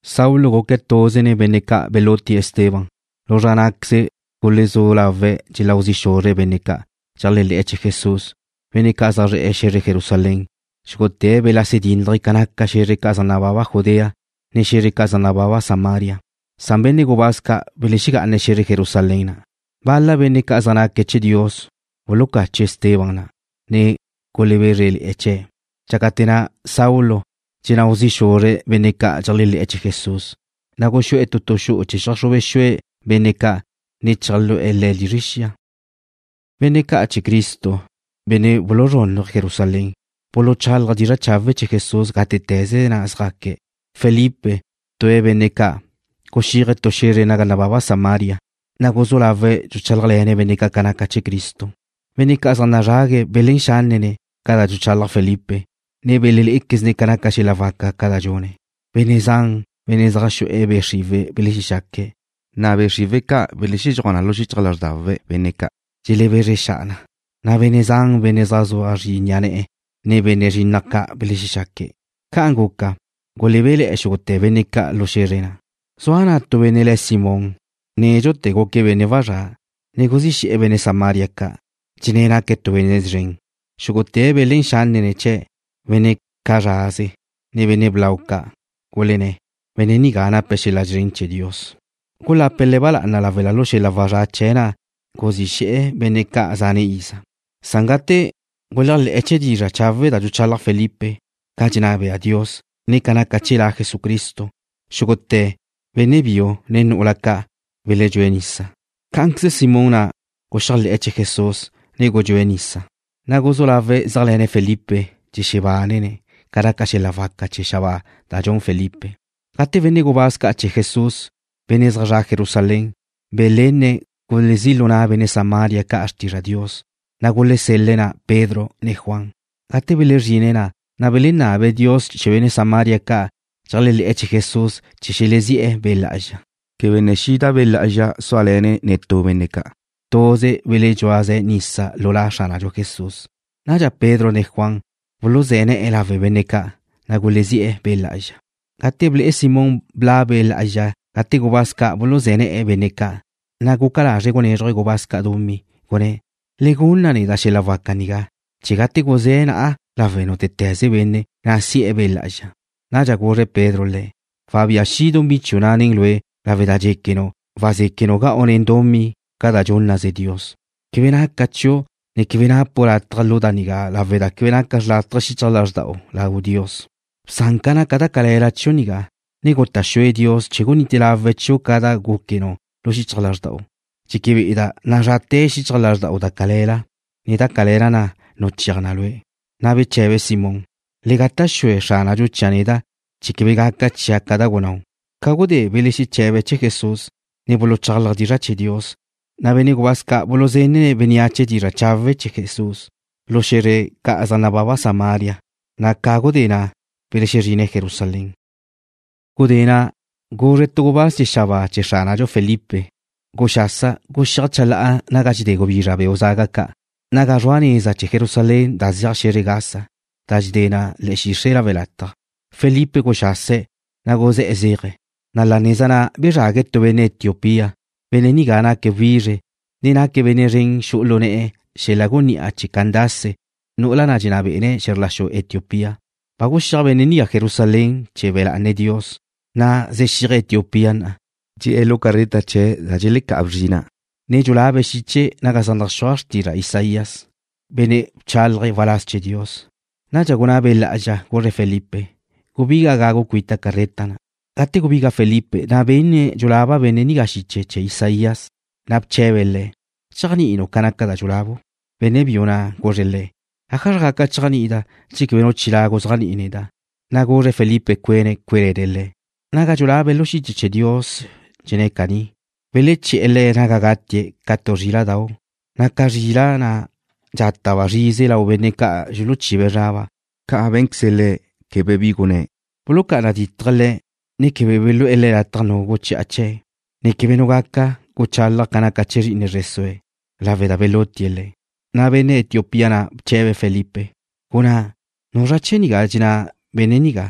Saulo guque̱' tuze nen benne' ca' belutie̱' Esteban. Lu zra ná'queze gulezú lawe̱' dxelau zi' xuzre̱' benne' ca' dxeléajle̱'e̱ chee̱ Jesús, benne' ca' zaj zre̱'e̱ xe̱zre Jerusalén. Xúgute̱' belexase dínnaje̱' ca naca xe̱zre ca' zaj nababa Judea, ne xe̱zre ca' zaj nababa Samaria. Benne' gubáz ca' belexegá'ane̱' xe̱zre Jerusalén na'. Bal-la benne' ca' zaj naque̱' chee̱ Dios bulucache̱' Esteban na', ne gulebézrele̱'e̱ chee̱'. Dxácate̱ na' Saulo dxenáu zi' xuzre̱' benne' ca' dxeléajle̱'e̱ chee̱ Jesús, na' guxú'e̱ tu tu xu'u chee̱ cheajxrube xue̱' benne' ca', ne cheajlu'e̱ le̱' lizre xia. Benne' ca' chee̱ Cristo, benne' buluzrúnnuje̱' Jerusalén, buluchálaje̱' dizra' chawe' chee̱ Jesús gátete̱ze na' zjaque̱'. Felipe, tue̱' benne' ca', guxíaje̱' tu xe̱zre naga nababa Samaria, na' guzú lawe̱' dxuchálajle̱ne̱' benne' ca' ca naca chee̱ Cristo. Benne' ca' zaj nazrague̱' belén xánnene̱' ca da dxuchalaj Felipe, ne belelé'equezne̱' ca naca xel-la' waca ca' da dxune̱'. Benne' zan, benne' zaj xu'e̱ be' xriwe̱' belexexaque̱', na' be' xriwe̱' ca' belexedxúaj na lu xichaj lázrdau benne' ca', dxelebezre xa'a na, na' benne' zan benne' zaj zua zri ni'a ne̱'e̱, ne benne' zrinnaj ca' belexexaque̱'. Ca'an guca, gulebéle̱'e̱ xúgute̱ benne' ca' lu xe̱zre na'. Zua na' tu benne' le̱' Simón, nédxute̱ guque̱' benne' wazrá', ne guzí xe̱'e̱ benne' Samaria ca', dxenné̱' naque̱' tu benne' szren. Xúgute̱' belén xánnene̱' chee̱', benne' cazraze ca', ne benne' blau ca', gulenné̱': ―Benne' nigá nape̱' xel-la' szren chee̱ Dios. Gulape̱' le̱' ba lá'ana lawe' da lu xel-la' wazrá' chee̱' na' guzí xe̱'e̱ benne' ca' zane' iza. Gate guléajle̱'e̱ chee̱ dizra' chawe' da dxuchalaj Felipe ca dxenná bea Dios, ne ca naca chee̱ La Jesucristo, xúgute̱', benne' biu, ne nu'ula ca', beledxúe̱' nisa. Cá'anqueze Simón na' guxéajle̱'e̱ chee̱ Jesús, ne gudxúe̱' nisa, na' guzú lawe̱' zéajle̱ne̱' Felipe, na' dxexebánene̱' ca naca xel-la' waca da za xabáa da dxun Felipe. Gate benne' gubáz ca' chee̱ Jesús, benne' zaj zre̱'e̱ Jerusalén, belenne̱' gulezí' lu na' benne' Samaria ca' xrtizra' Dios, na' gulesel-le̱' Pedro ne Juan na'. Gate belezrine̱' na', na' belenabe̱' law Dios chee̱ benne' Samaria ca' dxeléajle̱'e̱ chee̱ Jesús chee̱ xelezí'e̱ Be' Lá'azxa. Quebe ne xida Be' Lá'azxa súale̱ne̱' netú benne' ca'. Tuze beledxúaze̱' nisa lu La Xránadxu Jesús. Nadxa Pedro ne Juan buluzé̱ ne̱'e̱ lawe' benne' ca', na' gulezí'e̱ Be' Lá'azxa. Gate ble'e Simón bla' Be' Lá'azxa gate gubáz ca' buluzé̱ ne̱'e̱ benne' ca', na' guca lazre̱' gunézruje̱' gubáz ca' dumí, gunné̱': ―Le gunna neda' xel-la' waca nigá chee̱ gate guzéa' na'a lawe' nútete̱ze benne', na' si'e̱ Be' Lá'azxa. Nadxa guzre Pedro le̱': ―Wabía xi' dumí chiu' na' nen lue' lawe' da dxéquenu' wazéquenu' ga'u nen dumí ca da dxúnnaze Dios. Quebe naca chiu', ne quebe napu' lataj lu da nigá lawe' da quebe naca xrlátaje xichaj lázrda'u lau Dios. Bsan ca naca da cale̱la chiu' nigá, ne guta' xue Dios chee̱ gunite lawe̱' chiu' ca da gúquenu' lu xichaj lázrda'u. Dxeque be'eda' nazrate̱ xichaj lázrda'u da cale̱la, na' da cale̱la na' nuchéaj na lue'. Na' beche̱be Simón: ―Le gata' xue Xránadxu chia' neda', chee̱ quebe gaca chia' ca da gunnáu'. Ca gudé belexeche̱be̱' chee̱ Jesús, ne buluchálaje̱' dizra' chee̱ Dios, na' benne' gubáz ca' buluzenne̱' bénneache dizra' chawe' chee̱ Jesús lu xé̱zredu ca' zaj nababa Samaria, na' ca gudé na' belexezrine̱' Jerusalén. Gudé na' guzre tu gubáz chee̱ xabáa chee̱ Xránadxu Felipe: ―Guxasa, guxíaj chalá'a naga dxedé gubizra beu' zaga ca', naga zrua neza chee̱ Jerusalén da zeaj xe̱zre Gaza, da dxedé na le̱'e̱ xixre' lawe' lataj. Felipe guxase̱', na' guzé̱'e̱ zéaje̱', na' la neza na' bezrague̱' tu benne' Etiopía. Benne' nigá naque̱' wizre, ne naque̱' benne' szren xu'u lu ne'e̱ xel-la' gunní'a chee̱ Candace, nu'ula na' dxenná bé'ene̱' xe̱zr la xu Etiopía. Ba guxíaj benne' nigá Jerusalén chee̱ be̱ lá'ane̱' Dios. Na'a zexíaje̱' Etiopía na', dxe'e̱ lu carreta chee̱' da dxelecá'a bzrina', ne dxulabe̱' xiche naga zaj naxúaj xrtizra' Isaías, benne' bchálaje̱' waláz chee̱ Dios. Nadxa gunná Be' Lá'azxa, guzre̱' Felipe: ―Gubiga gagu cuita carreta na'. Gate gubiga Felipe na' benne̱' dxulaba bénnea' xiche chee̱ Isaías, na' bche̱be̱' le̱': ―¿Dxéajni'inu' ca naca da dxulabu'? Benne' biu na' guzre̱' le̱': ―¿Ájazra gaca chéajni'ida' che quebe nu chilá' guzéajni'i neda'? Na' guzre̱' Felipe cuene̱' cué'le̱ne̱' le̱'. Naga dxulabe̱' lu xiche chee̱ Dios dxenná na caní: Beleché̱'e̱ Le̱' naga gatie̱' ca tu zríla'dau', na' ca zrila' na' dxátaba' zrize lau benne' ca' dxuluchibe̱' zraba', ca' bé̱nqueze Le̱', quebe bi gunné̱'. Bulucá'ana ditje̱' Le̱', ne quebe belú'e̱ lataj nu guchi'a chee̱', ne quebe nu gaca guchálaje̱' ca naca chee̱ zri'ine zre sue̱', lawe' da belutie̱' Le̱'. Na' benne' Etiopía na' bche̱be̱' Felipe: ―Gunná, ¿nuzra chee̱ dxenná benne' nigá,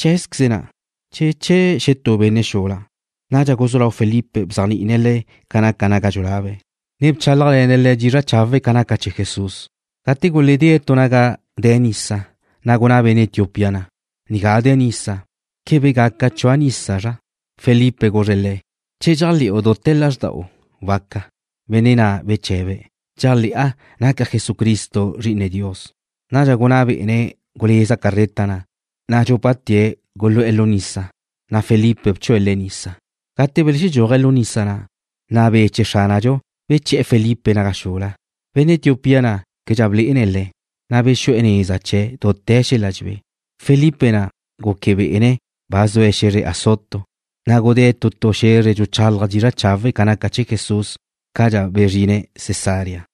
cheé̱queze̱' na', che chee̱ xetú benne' xula? Nadxa guzú lau Felipe bzéajni'ine̱' le̱' ca naca naga dxulabe̱', ne bchálajle̱ne̱' le̱' dizra' chawe' ca naca chee̱ Jesús. Gate guledée̱' tu naga de̱ nisa, na' gunná benne' Etiopía na': ―Nigá de̱ nisa. ¿Quebe gaca chua' nisa, zra? Felipe guzre̱' le̱': ―Che dxéajle̱'u dute̱ lázrda'u, waca. Benne' na' beche̱be̱': ―Dxéajle̱'a naca Jesucristo Zri'ine Dios. Nadxa gunná bé'ene̱' guleza carreta na', na' dxúpate̱' gulu'e̱ lu nisa, na' Felipe bchue̱' le̱' nisa. Gate belexedxúaje̱' lu nisa na', na' Be' chee̱ Xránadxu beche̱'e̱ Felipe naga xula. Benne' Etiopía na' québedxa blé'ene̱' le̱', na' bexu'e̱ neza chee̱' dute̱ xel-la' dxebé. Felipe na' guque bé'ene̱' ba zue̱' xe̱zre Azoto, na' gudée̱' tu tu xe̱zre dxuchálaje̱' dizra' chawe' ca naca chee̱ Jesús cadxa bezrine̱' Cesarea.